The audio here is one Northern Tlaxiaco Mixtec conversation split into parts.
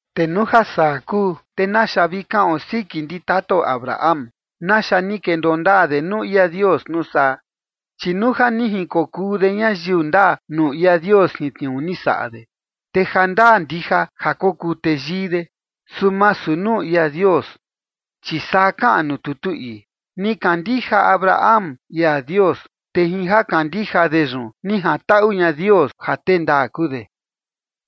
Te nuu ja saa kuu, te naxa vi kaꞌon siki ndi tatao Abraham, ¿naxa ni kendoo ndaa de nuu ia Dios nuu saa? Chi nuu ja ni jinkokuu de ñayiu ndaa nuu ia Dios jin tniuu ni saꞌa de, te jandaa ndija ja kokuu teyii de, su masu nuu ia Dios. Chi saa kaꞌan nuu tutu ii: “Ni kandija Abraham ia Dios, te jin ja kandija de yun ni jantaꞌu ña Dios ja tee ndaa kuu de”.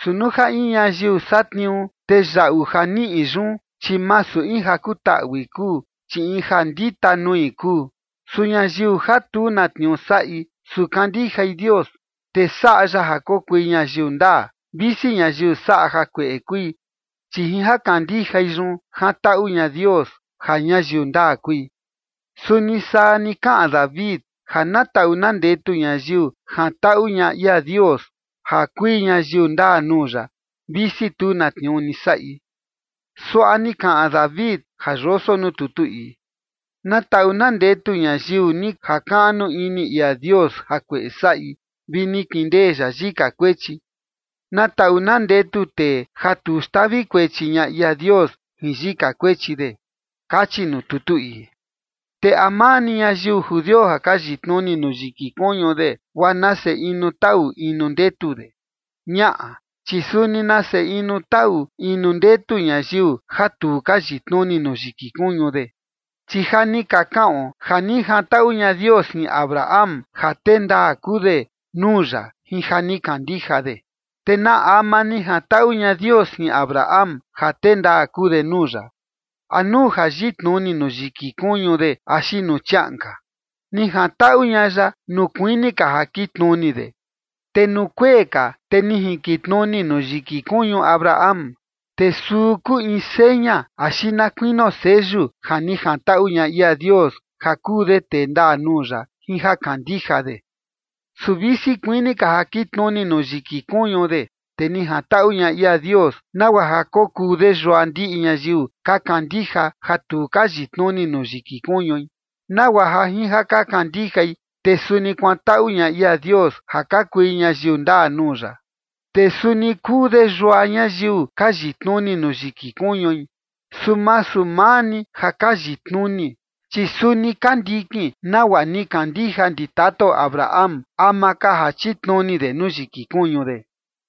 Su nuu ja in ñayiu satniuu, te yaꞌu ja niꞌi yun, chi masu in ja kutaꞌui kuu, chi in ja ndita nui kuu. Su ñayiu ja tu na tniuu saꞌi, su kandijai Dios, te saꞌa ya ja kokui ñayiu ndaa, visi ñayiu saꞌa jakueꞌe kui, chi jin ja kandijai yun jantaꞌu ña Dios ja ñayiu ndaa kui. Suni saa ni kaꞌan David, ja na taꞌu na ndetu ñayiu jantaꞌu ña ia Dios ja kui ñayiu ndaa nuu ya, visi tu na tniuu ni saꞌi. Suaꞌa ni kaꞌan David ja yoso nuu tutu ii: Na taꞌu na ndetu ñayiu ni jakaꞌnu ini ia Dios jakueꞌe saꞌi, vi ni kindee ya yika kuechi. Na taꞌu na ndetu tee ja tu xtavi kuechi ña ia Dios jin yika kuechi de, kachi nuu tutu ii. ¿Te a maa ni ñayiu judio ja ka yitnuni nuu yiki kuñu de guaa nase inu taꞌu inu ndetu de? Ñaꞌa, chi suni nase inu taꞌu inu ndetu ñayiu ja tu ka yitnuni nuu yiki kuñu de. Chi ja ni ka kaꞌon ja ni jantaꞌu ña Dios jin Abraham ja tee ndaa kuu de nuu ya jin ja ni kandija de. ¿Te na ama ni jantaꞌu ña Dios jin Abraham ja tee ndaa kuu de nuu ya? ¿A nuu ja yitnuni nuu yiki kuñu de axi nuu chiaꞌan ka? Ni jantaꞌu ña ya nuu kuini ka ja kitnuni de. Te nuu kuee ka, te ni jinkitnuni nuu yiki kuñu Abraham, te suu kuu in seña, axi na kuinio seyu ja ni jantaꞌu ña ia Dios ja kuu de tee ndaa nuu ya jin ja kandija de. Su visi kuini ka ja kitnuni nuu yiki kuñu de, te ni jantaꞌu ña ia Dios nagua ja kokuu de yua ndiꞌi ñayiu ka kandija ja tu ka yitnuni nuu yiki kuñui, nagua ja jin ja ka kandijai, te suni kuantaꞌu ña ia Dios ja ka kui ñayiu ndaa nuu ya. Te suni kuu de yua ñayiu ka yitnuni nuu yiki kuñui, su masu maa ni ja ka yitnuni, chi suni ka ndikin nagua ni kandija ndi tatao Abraham ama ka ja chitnuni de nuu yiki kuñu de.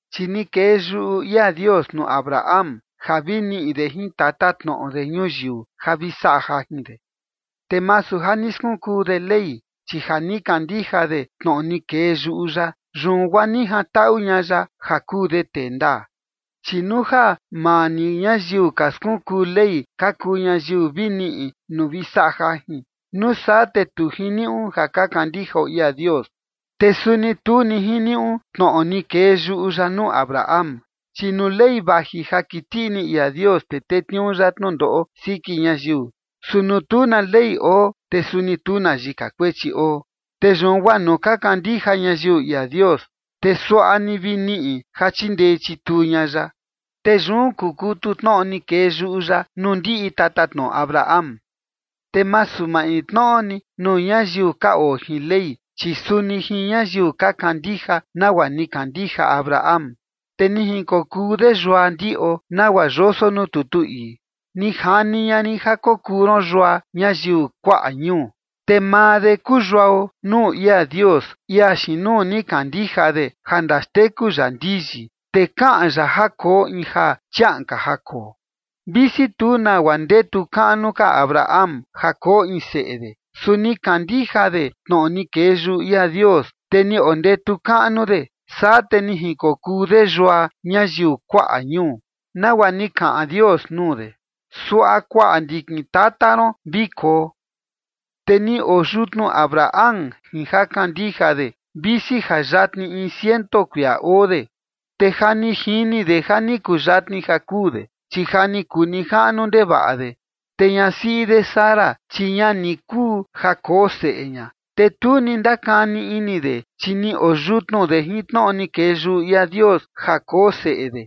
Chi ni kee yuꞌu ia Dios nuu Abraham ja vi niꞌi de jin tatatnoꞌo de ñuyiu ja vi saꞌa jajin de, te masu ja ni skunkuu de Ley, chi ja ni kandija de tnoꞌo ni kee yuꞌu ya, yun guaa ni jantaꞌu ña ya ja kuu de tee ndaa. Chi nuu ja maa ni ñayiu ka skunkuu Ley ka kuu ñayiu vi niꞌi nuu vi saꞌa jajin, nuu saa te tu jiniuꞌu ja ka kandijao ia Dios, te suni tu ni jiniuꞌu tnoꞌo ni kee yuꞌu ya nuu Abraham. Chi nuu ley vaji ja kiti ini ia Dios, te tetniuu ya tnundoꞌo siki ñayiu. Su nuu tu na ley oo, te suni tu na yika kuechi oo. Te yun guaa nuu ka kandija ñayiu ia Dios, te suaꞌa ni vi niꞌi ja chindee chituu ña ya. Te yun kukutu tnoꞌo ni kee yuꞌu ya nuu ndiꞌi tatatnoꞌo Abraham, te masu maintnoꞌo ni nuu ñayiu ka oo jin Ley, chi suni jin ñayiu ka kandija nagua ni kandija Abraham. Te ni jinkokuu de yua ndiꞌo, nagua yoso nuu tutu ii: “Ni jani ña rin ja kokuu ron yua ñayiu kuaꞌa ñuu”. Te maa de kuu yuao nuu ia Dios, ia xiin nuu ni kandija de, ja ndaxteku ya ndiyi, te kaꞌan ya ja koo in ja chiaꞌan ka ja koo. Visi tu nagua ndetu kaꞌnu ka Abraham ja koo in seꞌe de, su ni kandija de tnoꞌo ni kee yuꞌu ia Dios, te ni ondetu kaꞌnu de, saa te ni jinkokuu de yua ñayiu kuaꞌa ñuu, nagua ni kaꞌan Dios nuu de: “Suaꞌa kuaꞌa ndikin tata ron vi koo”. Te ni oo yutnu Abraham jin ja kandija de, visi ja yatni in ciento kuia oo de, te ja ni jini de ja ni kuyatni ja kuu de, chi ja ni kuu nijaꞌnu ndevaꞌa de. Te ñasiꞌi de Sara, chi ña ni kuu ja koo seꞌe ña. Te tu ni ndakani ini de, chi ni oo yutnu de jin tnoꞌo ni kee yuꞌu ia Dios ja koo seꞌe de,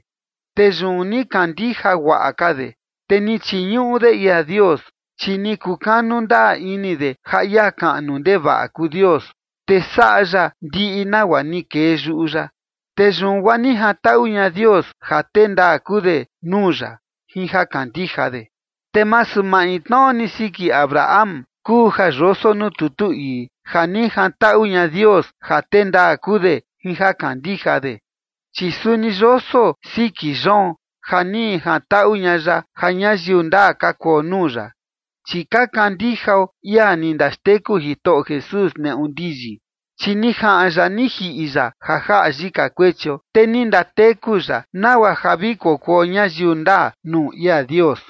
te yun ni kandija guaꞌa ka de, te ni chiñuꞌu de ia Dios. Chi ni kukanu ndaa ini de ja ia kaꞌnu ndevaꞌa kuu Dios, te saꞌa ya ndiꞌi nagua ni kee yuꞌu ya. Te yun guaa ni jantaꞌu ña Dios ja tee ndaa kuu de nuu ya jin ja kandija de. Te masu maintnoꞌo ni siki Abraham kuu ja yoso nuu tutu ii: “Ja ni jantaꞌu ña Dios ja tee ndaa kuu de jin ja kandija de”. Chi suni yoso siki yoon, ja ni jantaꞌu ña ya ja ñayiu ndaa ka kuo nuu ya, chi ka kandijao ia ni ndaxteku Jitoꞌo Jesús neꞌu ndiyi. Chi ni jaꞌan ya ni jiꞌi ya ja jaꞌa yika kuechio, te ni ndateku ya nagua ja vi kokuo ñayiu ndaa nuu ia Dios.